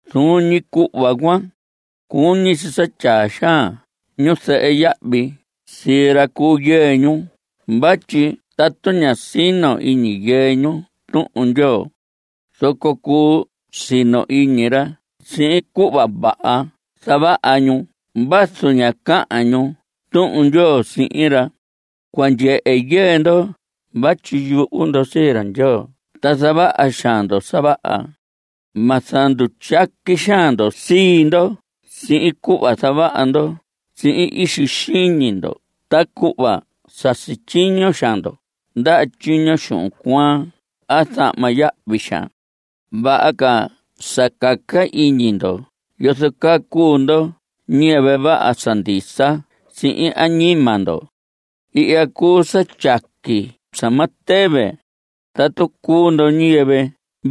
Zuun ñi cuhva cuan, cuñi si sa tyaa xaan ñuzɨhɨ yahvi sii ra cu yɨɨ ñu vatyi tatu ña sino iñi yɨɨ ñu Tuhun Ndyoo, zoco cuu sino iñi ra sihin cuhva vaha zavaha ñu vazu ña cahan ñu Tuhun Ndyoo sihin ra. Cua ndyehe yɨɨ ndo vatyi yuhu ndo sii ra Ndyoo ta zavaha xaan ndo sa vaha. Ma zandutyaqui xaan ndo sii ndo sihin cuhva zavaha ndo sihin ixi xiñi ndo ta cuhva sa sityiño xaan ndo ndaha tyiño xuhun cuaan a zahma yahvi xaan. Vaha ca sa caca iñi ndo yozo caa cuu ndo ñiyɨvɨ vaha sa ndisa sihin añima ndo. Ihya cuu sa tyaqui sa ma tɨvɨ, tatu cuu ndo ñiyɨvɨ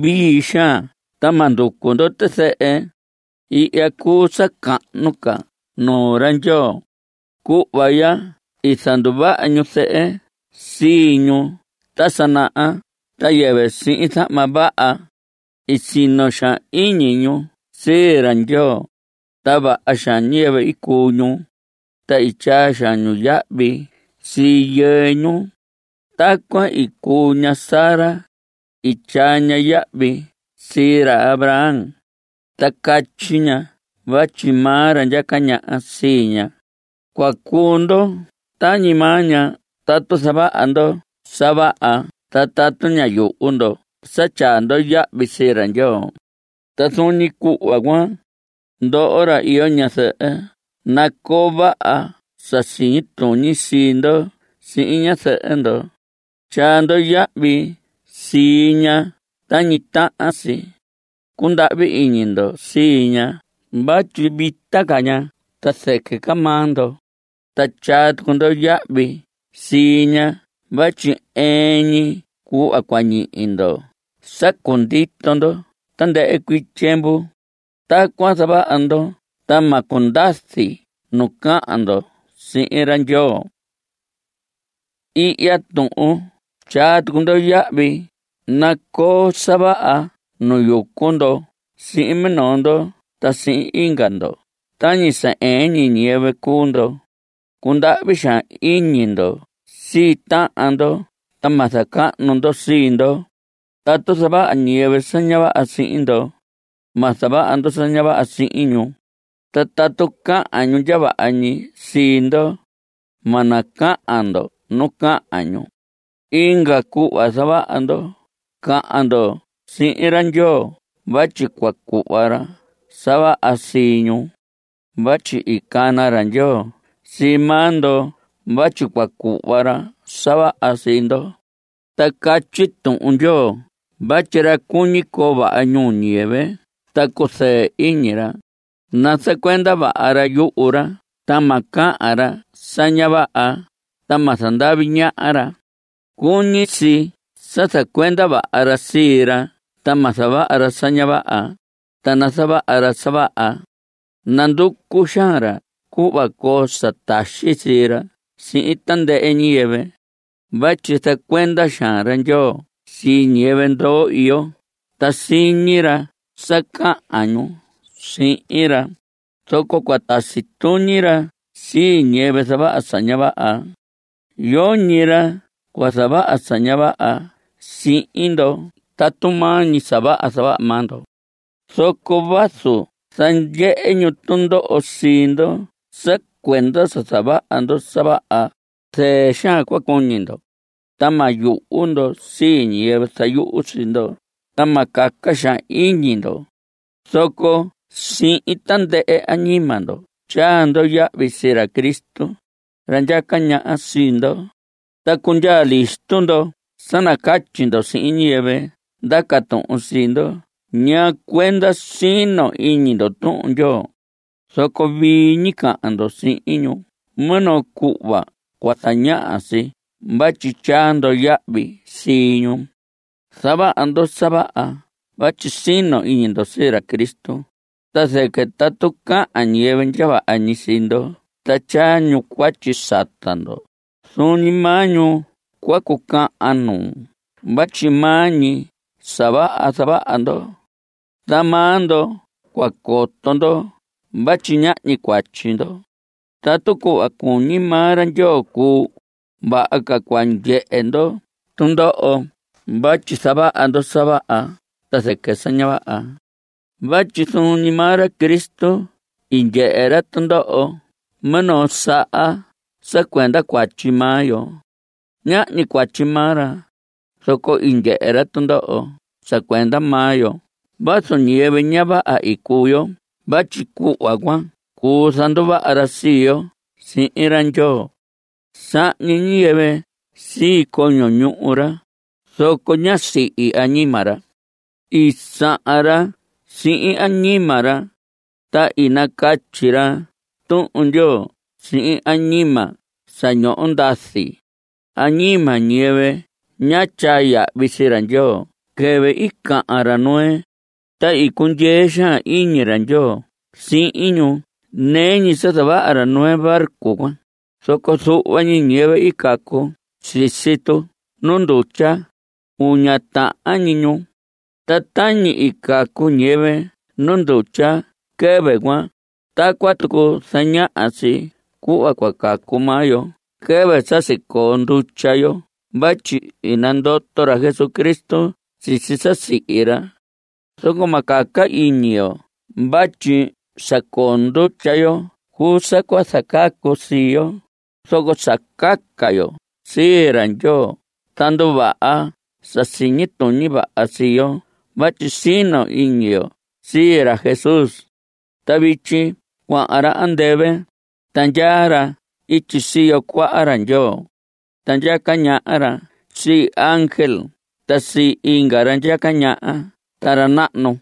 vii xaan ta ma nducu ndo tizɨhɨ. Ihya cuu sa cahnu ca nuu ra Ndyoo. Cuhva ya i zanduvaha ñuzɨhɨ sii ñu ta sa naha ta yɨvɨ sihin zahma vaha. I sino xaan iñi ñu sii ra Ndyoo, ta vaha xaan ñiyɨvɨ i cuu ñu, ta i tyaa xaan ñu yahvi sii yɨɨ ñu. Tacuan i cuu ña Sara. I tyaa ña yahvi sii ra Abraham, ta catyi ña vatyi maa ra ndyaca ñaha sii ña. Cua cuu ndo tañi maa ña tatu zavaha ndo sa vaha ta tatu ña yuhu ndo sa tyaa ndo yahvi sii ra Ndyoo. Ta zuun ñi cuhva, ndoho ra iyo ñazɨhɨ, nacoo vaha sa siñi tuñi sii ndo sihin ñazɨhɨ ndo. Tyaa ndo yahvi sii ña tañi tahan si. Cundahvi iñi ndo sii ña vatyi vita ca ña ta zɨquɨ ca maa ndo. Ta tyaa tucu ndo yahvi sii ña vatyi ɨɨn ñi cuhva cua ñihi ndo sa cundito ndo tandɨhɨ cuii tyiemvu. Tacuan zavaha ndo ta ma cundazi nu cahan ndo sihin ra Ndyoo. Ihya tuhun tyaa tucu ndo yahvi. Nacoo sa vaha nu yucu ndo sihin minoo ndo ta sihin inga ndo tañi sa ɨɨn ñi ñiyɨvɨ cuu ndo. Cundahvi xaan iñi ndo sii tahan ndo ta ma zacahnu ndo sii ndo. Tatu zavaha ñiyɨvɨ sa ña vaha sihin ndo, ma zavaha ndo sa ña vaha sihin ñu. Ta tatu cahan ñu ndya vaha ñi sii ndo, ma nacahan ndo nu cahan ñu. Inga cuhva zavaha ndo. Cahan ndo sihin ra Ndyoo vatyi cua cuhva ra sa vaha sii ñu. Vatyi i cana ra Ndyoo sii maa ndo vatyi cua cuhva ra sa vaha sii ndo. Ta catyi Tuhun Ndyoo vatyi: Ra cuñi coo vaha ñuu ñiyɨvɨ ta cuzɨɨ iñi ra, nazacuenda vaha ra yuhu ra ta ma cahan ra sa ña vaha, ta ma zandavi ñaha ra. Cuñi si sa zacuenda ra sii ra ta ma zavaha ra sa ña vaha, ta nazavaha ra sa vaha. Nanducu xaan ra cuhva coo sa taxi sii ra sihin tandɨhɨ ñiyɨvɨ. Vatyi zacuenda xaan ra Ndyoo sii ñiyɨvɨ ndoo iyo, ta siñi ra sa cahan ñu sihin ra, zoco cua tasi tuñi ra sii ñiyɨvɨ zavaha sa ña vaha. Yoñi ra cua zavaha sa ña vaha sihin ndo tatu maa ñi sa vaha zavaha maa ndo. Zoco vazu zandyehe ñu tundoho sii ndo sa cuenda sa zavaha ndo sa vaha, zɨɨ xaan cua cuñi ndo. Ta ma yuhu ndo sii ñiyɨvɨ zayuhu sii ndo, ta ma caca xaan iñi ndo. Zoco sihin tandɨhɨ añima ndo tyaa ndo yahvi sii ra Cristo, ra ndyaca ñaha sii ndo. Ta cundyaa listo ndo sa nacatyi ndo sihin ñiyɨvɨ ndaca tuhun sii ndo ñaa cuenda sino iñi ndo Tuhun Ndyoo. Zoco vii ñi cahan ndo sihin ñu minoo cuhva cua zañaha si vatyi tyaa ndo yahvi sii ñu. Zavaha ndo sa vaha vatyi sino iñi ndo sii ra Cristo, ta zɨquɨ tatu cahan ñiyɨvɨ ndya vaha ñi sii ndo ta tyaa ñu cuatyi sata ndo, zuun ñi maa ñu cua cucahan nuu vatyi maa ñi sa vaha zavaha ndo. Ta maa ndo cua coto ndo vatyi ñahñi cuatyi ndo. Tatu cuhva cuñi maa ra Ndyoo cuu, vaha ca cua ndyehe ndo tundoho vatyi zavaha ndo sa vaha ta zɨquɨ sa ña vaha. Vatyi zuun ñi maa ra Cristo i ndyehe ra tundoho minoo saha sa cuenda cuatyi maa yo. Nahñi cuatyi maa ra, zoco i ndyehe ra tundoho sa cuenda maa yo vazu ñiyɨvɨ ña vaha i cuu yo vatyi cuhva cuan cuu zanduvaha ra sii yo sihin ra Ndyoo. I sahñi ñiyɨvɨ sii coño ñuhu ra, zoco ñá sihi añima ra. I sahan ra sihin añima ra, ta i nacatyi ra Tuhun Ndyoo sihin añima sa ñoho ndazi. Añima ñiyɨvɨ ñá tyaa yahvi sii ra Ndyoo quɨvɨ i cahan ra Noé. Ta i cundyee xaan iñi ra Ndyoo sihin ñu nɨɨ ñi sa zavaha ra Noé barco cuan, zoco zuhva ñi ñiyɨvɨ i cacu sisi tu nu ndutya. Uña tahan ñi ñu. Ta tañi i cacu ñiyɨvɨ nu ndutya quɨvɨ cuan, tacuan tucu zañaha si cuhva cua cacu maa yo quɨvɨ sa sicoo ndutya yo vatyi i nandoto ra Jesucristo sisi sa i sihi ra. Zoco ma caca iñi yo vatyi sa coo ndutya yo cuu sa cua zacacu sii yo, zoco sa caca yo sii ra Ndyoo ta nduvaha sa siñi tuñi vaha sii yo vatyi sino iñi yo sii ra Jesús. Ta vityi cuahan ra andɨvɨ, ta ndyaa ra ityi siyo cuaha ra Ndyoo. Ta ndyaca ñaha ra sii ángel ta sii inga ra ndyaca ñaha ta ra nahnu.